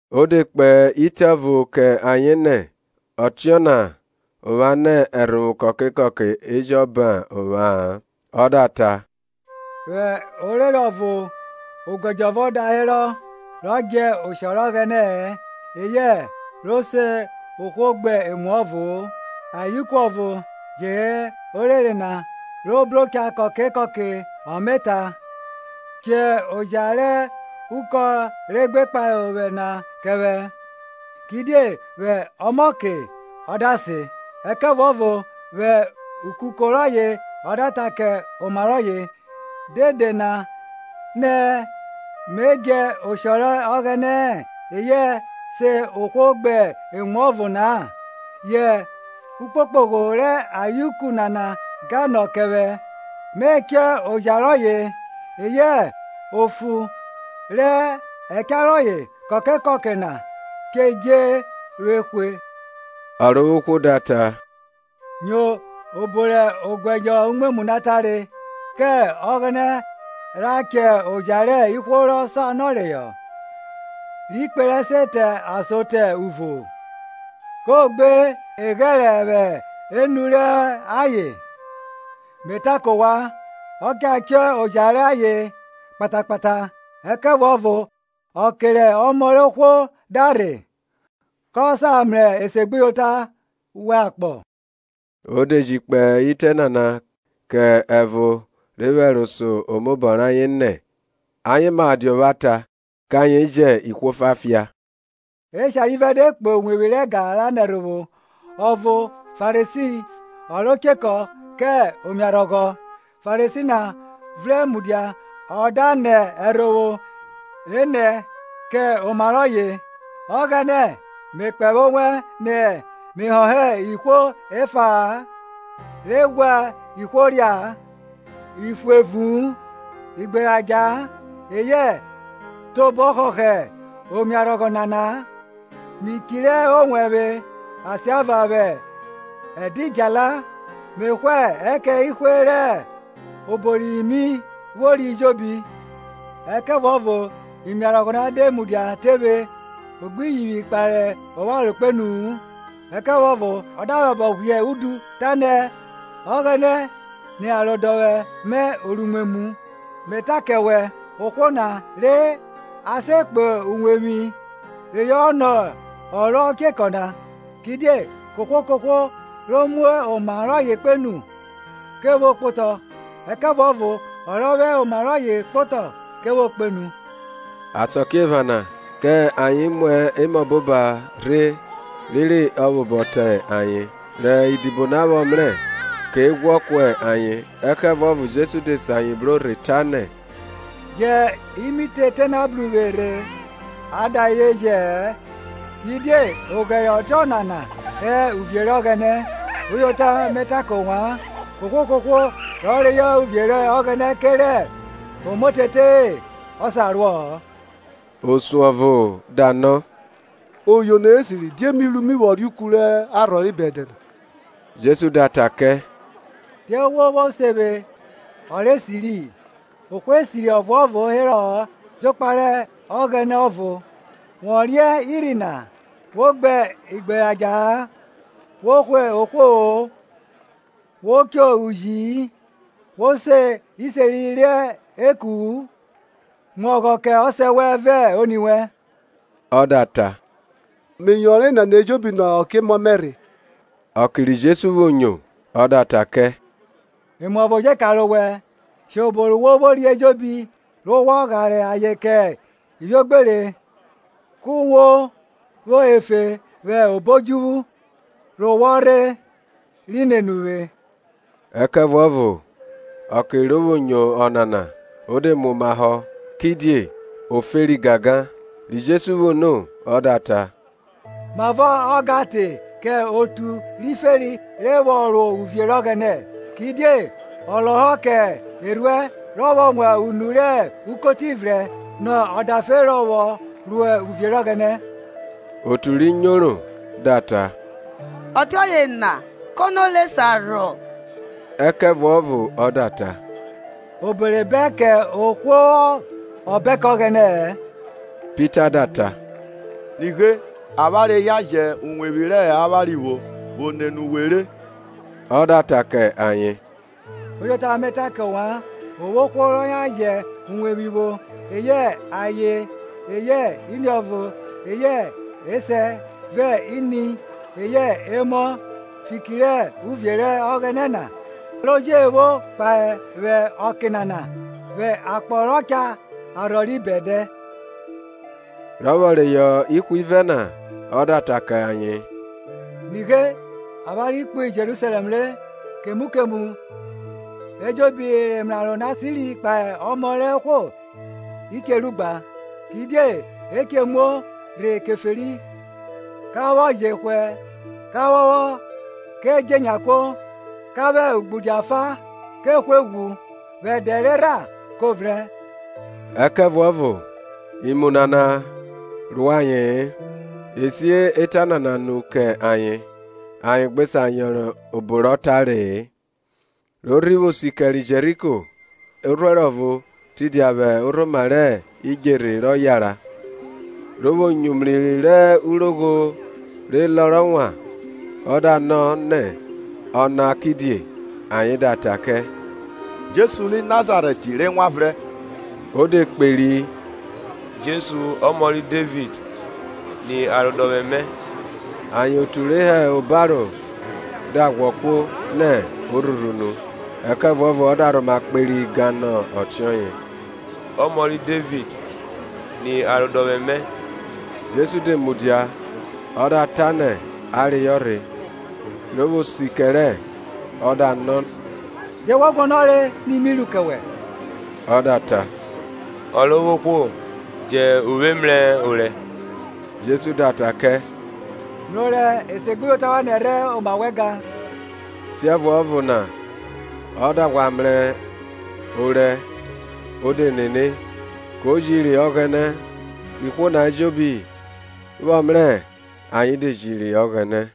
Ọ de kpe itẹ ọvo kẹ ayen nẹ, ọtiọna ovwan nẹ ẹrhovwo kọke kọke e jọ bẹn ovwa-an. Ọ da ta, Vwẹ orere ọvo oguẹdjọ ọvo da herọ rọ djẹ oshọ rẹ Ọghẹnẹ-ẹ eyẹ ro se ohwo gbe emuọvo-o; ayeuku ọvo je hẹ orere na ro bro cha kọke kọke ọ me ta, chọ oja rẹ ukọn ro gbe kpahe ovwẹ na kẹ vwẹ. Kidie vwẹ ọmọke ọ da sen; ẹkẹvuọvo vwẹ ukuko rọye ọ da ta kẹ oma rọye, Dede na nẹ me djẹ oshọ rẹ Ọghẹnẹ-ẹ eyẹ se ohwo gbe emuọvo-o na, yẹ ukpokpogho rẹ ayeuku nana gan nọ kẹ vwẹ, me chọ oja rọye, eyẹ ofu rẹ ẹcha rọye kọke kọke na che dje vwe hwe. Ọrovwohwo da ta, Nyo obọ rẹ oguẹdjọ umwemwu na tare. Kẹ Ọghẹnẹ rha chọ oja rẹ Ihwo rọ sanọ reyọ, ri kperẹ se te ason te uvo-o? Ko gbe eghẹrẹ vwẹ enu rọ ayen? Me ta kọ ovwan, ọ cha chọ oja rọ ayen kpata kpata. Ẹkẹvuọvo ọke rẹ Ọmọ rẹ ohwo da rhe, kọ sa mrẹ esegbuyota vwẹ akpọ? O de ji kpe itẹ nana kẹ ẹvo re vwẹ ẹro so omaobọ rẹ ayen nẹ ayen ma dia ọvwata kẹ ayen jẹ ihwo efa fia. Eshare ivẹ de kpo uwevwi rẹ ẹga ra nẹ ẹrhovwo, ọvo Farisi ọ ro chekọ kẹ omiarhọghọ. Farisi na vrẹn mudia ọ da nẹ ẹrhovwo enẹ kẹ oma rọye, Ọghẹnẹ, me kpẹvwẹ owẹ nẹ me họhọ ihwo efa-a, re ghwa ihwo ria, ifuevu-u, igberadja, eyẹ tobọ họhọ omiarhọghọ nana. Mi chirẹ owẹvwe asiava vwẹ ẹdidjala, me hwa ẹkẹn ehwe rẹ obo ri mi vwori ejobi. Ẹkẹvuọvo omiarhọghọ na, de mudia tephe, o gbi yivwi kpare opharo kpenu-u, ẹkẹvuọvo ọ da vwẹ abọ ghwiẹ udu, tanẹ, Ọghẹnẹ ni arodọvwẹ mẹ oruimwemwu! Me ta kẹ wẹ, ohwo na re ase kpo uwevwi rọye nọ ọ ro chekọ na; kidie kohwo kohwo ro mu oma rọye kpenu ke vwo kpotọ, ẹkẹvuọvo ọ rọ vwẹ oma rọye kpotọ ke vwo kpenu. Asakiephana kẹ ayen muẹ emọboba rhe rere ọ vwẹ obọ te ayen; rẹ idibo na vwọ mrẹ, ke ghwọ kuẹ ayen. Ẹkẹvuọvo Jesu de se ayen bro rhe, tanẹ, Jẹn imitete na bru vwe rhe a da ayen jẹ-ẹ; kidie oghẹre ọtiọnana hẹ uvie rẹ Ọghẹnẹ. Uyota, me ta kẹ ovwan, kohwo kohwo rọ reyọ uvie rẹ Ọghẹnẹ kerẹ omotete-e ọ sa ruọ-ọ. Osun ọvo da nọ, Oyono rẹ esiri, die mi ru me vwọ reuku rẹ arhọ ri bẹdẹ na? Jesu da ta kẹ, Die wo vwo se vwe ọ rẹ esiri? Ohwo esiri ọvuọvo herọ-ọ jokpa rẹ Ọghẹnẹ ọvo. Wọ riẹn irhi na: Wo gbe igberadja-a, Wo hwe ohwo-o, Wo cho uji-i, Wo se iseri rẹ eku-u, mu ọghọ kẹ ọsẹ wẹn vẹ oni wẹn. Ọ da ta, Me yọnre enana ejobi nẹ ọke-emọ mẹ rhe. Ọke ri Jesu vwo nyo, ọ da ta kẹ, Emu ọvo je kanre owẹ. Shẹ obo wo vwori ejobi re wọ ghare ayen kẹ ivwiogbere, ku wo vwo efe vwẹ obo odjuvwu; re wọ rhe, ri nene uvwe. Ẹkẹvuọvo ọke ro vwo nyo ọnana o de muomahọ, kidie o feri gangan. Ri Jesu vwo no ọ da ta, Mavọ ọ gan te kẹ otu ri feri re vwọ ro uvie rẹ Ọghẹnẹ! Kidie ọ lọhọ kẹ erhuẹn rọ vwọ wan unu rẹ ukoti vrẹn nọ ọdafe rọ vwọ ro uvie rẹ Ọghẹnẹ. otu ri nyoro da ta, ọtiọye na kono re sa rhọ? Ẹkẹvuọvo ọ da ta, obo re bẹn kẹ ohwo ọ bẹn kẹ Ọghẹnẹ-ẹ. Pita da ta, Nighe, avwanre yan je iwevwi rẹ avwanre vwo vwo nene uwe re. Ọ da ta kẹ ayen, Uyota me ta kẹ ovwan, o vwo ohwo rọ yan jẹ uwevwi vwo eyẹ aye eyẹ iniọvo eyẹ esẹ vẹ ini eyẹ emọ, fiki rẹ uvie rẹ Ọghẹnẹ na, ro je vwo kpahe vwẹ ọke nana, vwẹ akpọ rọ cha arhọ ri bẹdẹ. Rọ vwọ reyọ ihwivẹ na, ọ da ta kẹ ayen, Nighe, avwanre kpo Jerusalẹm re, kemu kemu ejobi rẹ emraro na si kpahe Ọmọ rẹ ohwo i che ru gba. Kidie e che muo rhe Keferi, ka vwọ jehwẹ ka phọphọ ke dje enya kuo; ka vwẹ ugbudia fa ke hwe ghwu, vwe ẹdẹ rerha kọ vrẹn. Ẹkẹvuọvo imu nana ro aye-en, e si eta nana nu kẹ ayen, ayen gbe sa yọnre obo rọ tare-e. Ro rhi vwo si kẹre Jeriko, orhuẹro ọvo tidia vwẹ orhoma rẹ idjerhe rọ yara; ro vwo nyo umri rẹ urogho re lọrọ wan, ọ da nọ nẹ ọna kidie. Ayen da ta kẹ, Jesu ri Nazarẹt re wanvrẹn. Ọ de kperi, Jesu, Ọmọ ri Devid, ni arodọvwẹ mẹ! Ayen otu re hẹ obaro da ghwọ kuo, nẹ o rhurhu unu; ẹkẹvuọvo ọ da rhoma kperi gan nọ ọtiọye, Ọmọ ri Devid, ni arodọvwẹ mẹ! Jesu de mudia, ọ da ta nẹ a reyọ rhe; ro vwo si kẹrẹ, ọ da nọ, Die wọ guọnọre ni mi ru kẹ wẹ? Ọ da ta, Ọrovwohwo, jẹn uvwe mrẹ orẹ. Jesu da ta kẹ, Mrẹ orẹ; esegbuyota wẹn nẹrhẹ oma wẹ gan. Siẹvuọvo na ọ da ghwa mrẹ orẹ o de nene, ko jiri Ọghẹnẹ; rẹ ihwo na ejobi, vwọ mrẹ, ayen de jiri Ọghẹnẹ.